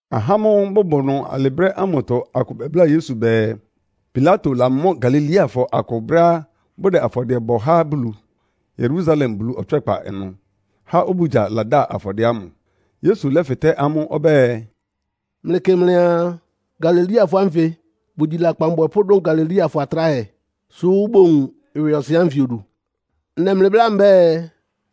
Ahá ámʋ́ʋ́ bʋbʋ ɩnʋ alɩ brɛ́ ámʋtɔ akʋ bɛbláa Yesu bɛɛ, Pilato lamɔ́ Galileafɔ akʋ brɛ́á bʋdɛ afɔdɩɛ bɔ há Bulu, Yerusalem Bulu ɔtswɛ́kpa ɩnʋ, há obugya lada afɔdɩɛ ámʋ. Yesu lɛ́fɩtɛ́ amʋ́ ɔbɛ́ɛ, “Mlɩkɩ́ mlɩaa, Galileafɔ ánfɩ bʋgyi lakpan abwɛpʋ́ dʋn Galileafɔ atráhɛ, sʋ́ bowun ɩwɩɔsɩn ánfɩ odu? Ndɛ mlɩ bláa mbɛ́ɛ,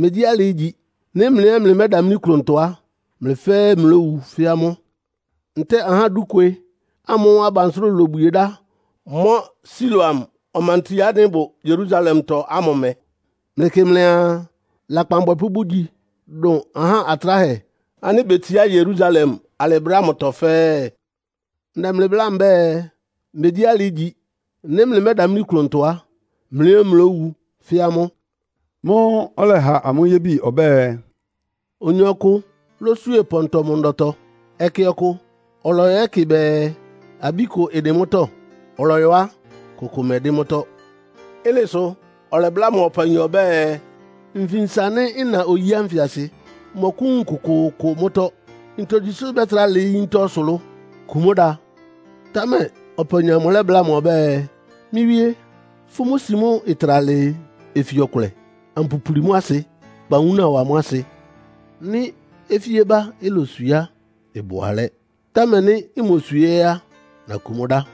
megyí alɩ ígyi! Nɩ́ mlɩ ɛ́ mlɩmɛ́damlí klʋntɔ á, mlɩ fɛ́ɛ́ mlówu fɛ́ amʋ́. Ntɛ́ɛ ahá dúkwe ámʋ́ʋ́ abansʋ́rʋ lobwie dá mɔ́ Siloam ɔmanti ánɩ́ ɩbʋ Yerusalemtɔ ámʋ mɛ́, mlɩkɩ́ mlɩaa, lakpan abwɛpʋ́ bʋgyi dʋn aha atráhɛ ánɩ́ betsiá Yerusalem alɩ brɛ́ ámʋtɔ fɛ́ɛ́? Ndɛ mlɩ bláa mbɛ́ɛ, megyí alɩ ígyi. Nɩ́ mlɩmɛ́damlí klʋntɔ á, mlɩ ɛ́ mlówu fɛ́ amʋ́.” Mʋ́ʋ́ ɔlɛha amʋ́ yébi ɔbɛ́ɛ, “Oyin ɔkʋ lótswíe pɔntɔ mʋ ndɔtɔ. Ɛkɛ ɔkʋ ɔlɔyɔ yɛ́kɩ bɛɛ, abí kʋ ɩdɩn mʋ́tɔ́. Ɔlɔyɔ á, kʋkʋ mɛdɩ́n mʋ́tɔ́. Ɩ́nɩ sʋ ɔlɛbláa mʋ ɔpayin ɔbɛ́ɛ, ‘Nfinsa nɩ́, nna oyí ánfɩ asɩ. Mmɔkʋ́wun kʋkʋʋkʋ mʋ́tɔ́. Ntogyi sʋ́ ɩbɛ́trá lɩɩ́ yíntá ɔsʋlʋ́ʋ? Kun mʋ́ da!’ Támɛ ɔpayin amʋ lɛ́bláa mʋ ɔbɛ́ɛ, ‘Mɩ́ wíé, fʋ́ mʋ́ si mʋ́ ɩtra lɩɩ ofi ɔkʋlɛ, ampulipuli mʋ́ asɩ, kpa wúna wa mʋ́ asɩ. Nɩ́ ofíébá iloswie á, ɩbʋ alɛ́, támɛ nɩ́ imoswie á, nakun mʋ́ dá.’”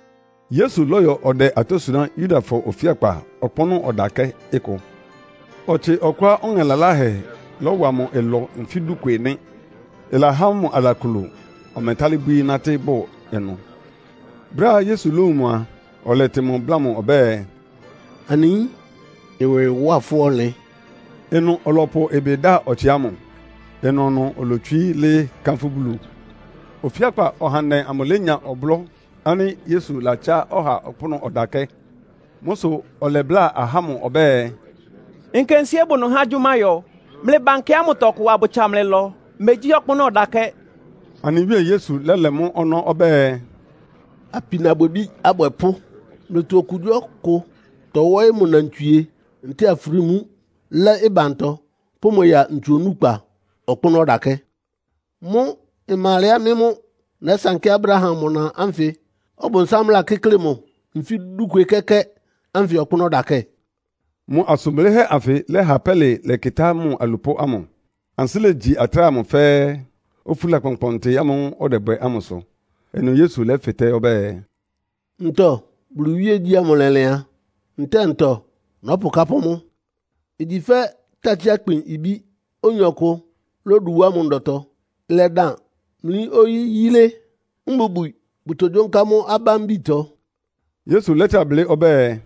Yesu lɔ́yɔ ɔdɛ atɔ́ suná Yudafɔ ofíakpa ɔkpʋ́nʋ́ ɔdakɛ́ ɩkʋ. Ɔtsɩ ɔkʋá ɔŋɛ laláhɛ lɔ́wa mʋ ɩlɔ nfí dúkwe nɩ́, ɩlahá mʋ alaklo, ɔmɛtálɩ́ bwíí nátɩ́ bʋ ɩnʋ. Brɛ́á Yesu lówun mʋ á, ɔlɛtɩ mʋ bláa mʋ ɔbɛ́ɛ, “Anɩ yín, ɩwɩ ɩwá fʋ́ ɔnlɩn!” Ɩnʋ ɔlɔpʋ ɩbɩ da ɔtsɩ ámʋ. Ɩnʋnʋ olotswií lɩ́ɩ́ kánfʋ́ Bulu. Ofíakpa ɔhandɛ amʋ lénya ɔblɔ́ ánɩ́ Yesu latsá ɔha ɔkpʋ́nʋ́ ɔdakɛ́. Mʋ́ sʋ ɔlɛbláa ahá ámʋ ɔbɛ́ɛ, “Nkensíé bʋ ɩnʋ há agyʋ́má yɔ. Mlɩba nkɛ ámʋtɔ, abʋtsa mlɩ ɩlɔ. Megyí ɔkpʋ́nʋ́ ɔdakɛ́!” Anɩ Wíe Yesu lɛ́lɛ mɔ́ ɔnɔ́ ɔbɛ́ɛ, “Apinabwɛbí abwɛpʋ́! Mlɩtɔ okugyíɔkʋ tɔwɔ́ɩ́ mʋ nnantswie ntɛ́ɛ afrímú lɛ́ ɩbantɔ, pʋ́ amʋ́ ya ntsu onúkpa ɔkpʋ́nʋ́ ɔdakɛ́. Mʋ́ ɩma alɛá mɩ́ mʋ́ nɛ́sankɩ́ Abraham mʋ na ánfɩ Ɔbʋnsám lakɩ́klɩ mʋ nfí dúkwe kɛ́kɛ́ ánfɩ ɔkpʋ́nʋ́ ɔdakɛ́?” Mʋ asʋn blɩ́hɛ́ anfɩ lɛ́ha pɛ́lɩ lɛ́kɩtá mʋ alupʋ́ ámʋ, ansɩ́ légyi atráhɛ amʋ fɛ́ɛ́, ofúla kpɔnkpɔntɩ ámʋ́ʋ́ ɔdɛbwɛ ámʋ sʋ. Ɩnʋ Yesu lɛ́fɩtɛ́ ɔbɛ́ɛ, “Ntɔ Bulu iwíegyí ámʋ lɛlɩan? Ntɛ́ɛ ntɔ nɔ́pʋkápʋ́ mʋ? Igyi fɛ́ takyí-akpin ibí, oyin ɔkʋ lódu wá mʋ ndɔtɔ. Ɩlɛdan mlí oyi yilé, mbubwi bʋtogyónká mʋ́ abámbitɔ.” Yesu lɛ́trá blɩ́ ɔbɛ́ɛ,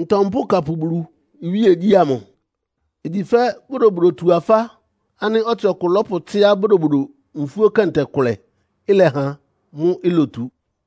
“Ntɔ mpʋ́kapʋ Bulu iwíegyí ámʋ? Igyi fɛ́ Bodobodotu-afá ánɩ́ ɔtsɩ ɔkʋ lɔ́pʋtsɩ́á bodobodo nfúó kɛntɛ kʋlɛ, ɩlɛha mʋ́ ilotu.”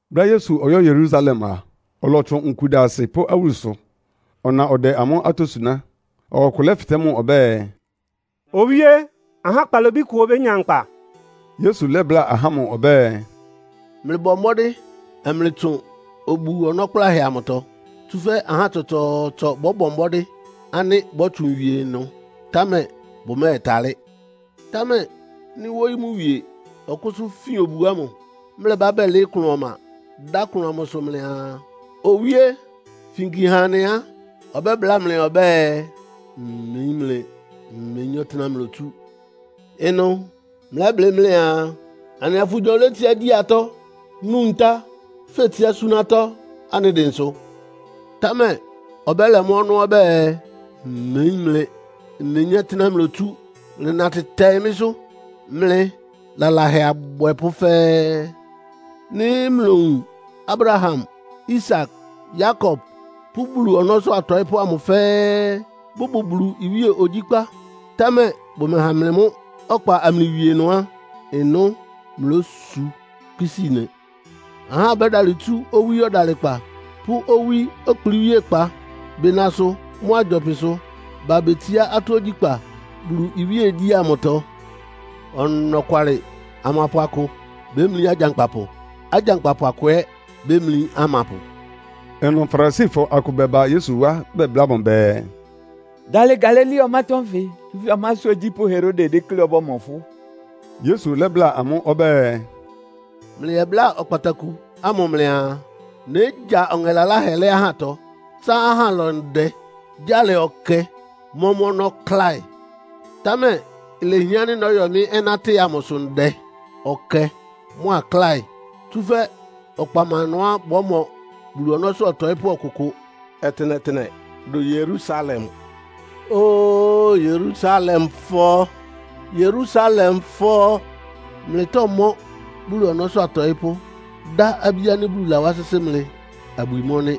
Brɛ́á Yesu ɔyɔ́ Yerusalem a, ɔlɔtsʋn nkudasɩ pʋ́ awúlusʋ. Ɔna ɔdɛ amʋ́ atɔ́ suná. Ɔha ɔkʋ lɛ́fɩtɛ́ mʋ ɔbɛ́ɛ, “Owíé, ahá kpalobí kʋ obénya nkpa?” Yesu lɛ́bláa ahá ámʋ ɔbɛ́ɛ, “Mlɩbɔ mbɔ́dɩ́ amlɩtsʋn obu-ɔnɔ́ kplánhɛ amʋtɔ. Tsúfɛ́ ahá tsɔtsɔɔtsɔ bɔ́bɔ mbɔ́dɩ́ ánɩ́ bɔ́tsʋn wie ɩnʋ, támɛ bʋmɛ́ɛtalɩ́. Támɛ nɩ́ wóyí mʋ wie ɔkʋ́sʋ́ fin obu ámʋ, mlɛbá bɛlɩɩ́ klʋn ɔma, dá klʋn amʋsʋ mlɩaa, ‘Owíé, finki ha anɩ!’ á, ɔbɛ́bláa mlɩ ɔbɛ́ɛ, ‘Mmeyín mlɩ, mmeyín ɔtɩ́nɛ́á mlotsú.’ Ɩnʋ́ mlɛ́blɩ́ mlɩaa, ‘Anɩa fʋnyɔ létsiá gyi atɔ́, nú ntá, fetsiá súná atɔ́ anɩ dɩnsʋ!’ Támɛ ɔbɛ́lɛ mʋ́ ɔnɔ́ ɔbɛ́ɛ, ‘Mmeyín mlɩ. Mmeyín ɔtɩ́nɛ́á mlotsú. Mlɩnatɩ tɛɩ mɩ́sʋ́, mlɩ lalahɛ abwɛpʋ́ fɛ́ɛ́!’ Nɩ́ mlowun Abraham, Isak, Yakob pʋ́ Bulu ɔnɔ́sʋ́ atɔɩ́pʋ́ amʋ fɛ́ɛ́ bʋbʋ Bulu iwíe ogyíkpá, támɛ bʋmɛha mlɩ mʋ́ ɔkpa amlɩwie ɩnʋ á, ɩnʋ́ mlósu kpisíi nɩ. Ahá bótsu owí ɔdalɩkpa pʋ́ owí ɔkplɩ́wíékpá, bɩnasʋ mʋ́a gyɔpɩsʋ ba betsiá atɔ́ ogyíkpá Bulu iwíegyí ámʋtɔ. Ɔnɔkwalɩ, amapʋ akʋ bémlí agyankpapʋ. Agyankpapʋ akʋ ɛ́ bémlí amapʋ.” Ɩnʋ Farisifɔ akʋ bɛba Yesu wá bɛbláa mʋ bɛɛ, “Dalɩ Galilea ɔmátɔ́ nfɩ, tsúfɛ́ ɔmásʋ́ ogyípʋ́ Herode dékléá ɔbɔ́mɔ fʋ́.” Yesu lɛ́bláa amʋ́ ɔbɛ́ɛ, “Mlɩyɛbláa ɔkpataku ámʋ mlɩaa, ‘Négya ɔŋɛ laláhɛ lɛ́ ahátɔ, tsá ahá ɩlɔ ndɛ, gya lɛ ɔkɛ, mɔ́ mʋ́ ɔnɔ́ kláɩ.’ Támɛ ilehián ánɩ́ nɔ́yɔ mɩ́ ɔnátɩ amʋsʋ ndɛ, ɔkɛ mʋ́a kláɩ. Tsúfɛ́ ɔkpa má ɩnʋá bɔ́mɔ Bulu ɔnɔ́sʋ́ ɔtɔɩ́pʋ́ ɔkʋkʋ ɔtɩnɛtɩnɛ, dʋn Yerusalem! “Óo Yerusalemfɔ, Yerusalemfɔ! Mlɩtɔ́mɔ́ Bulu ɔnɔ́sʋ́ atɔɩ́pʋ́, dá abí ánɩ́ Bulu lawá sɩ́sɩ́ mlɩ abwi mɔ́ nɩ́.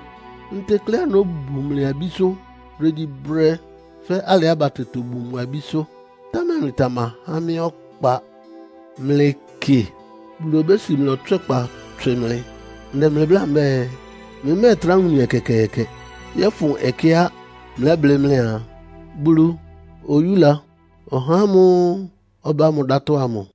Ntekleá nóbun mlɩ abísʋ́ brégyíbrɛ́, fɛ́ alɩá batɛ tobun mʋ abísʋ́, támɛ mlɩtamahá mɩ́ ɔkpa. Mlɩkɩ, Bulu obési mlɩ ɔtswɛ́kpa tswɩ mlɩ. Ndɛ mlɩ bláa mbɛ́ɛ, mlɩmɛ́ɛtrá wun mɩ ɛkɛkɛɛkɛ, yɔ́fʋn ɛkɛá mlɛ́blɩ́ mlɩaa, ‘Bulu oyúla ɔhá ámʋ́ʋ́ ɔbá mʋ dátɔ́’ ámʋ.”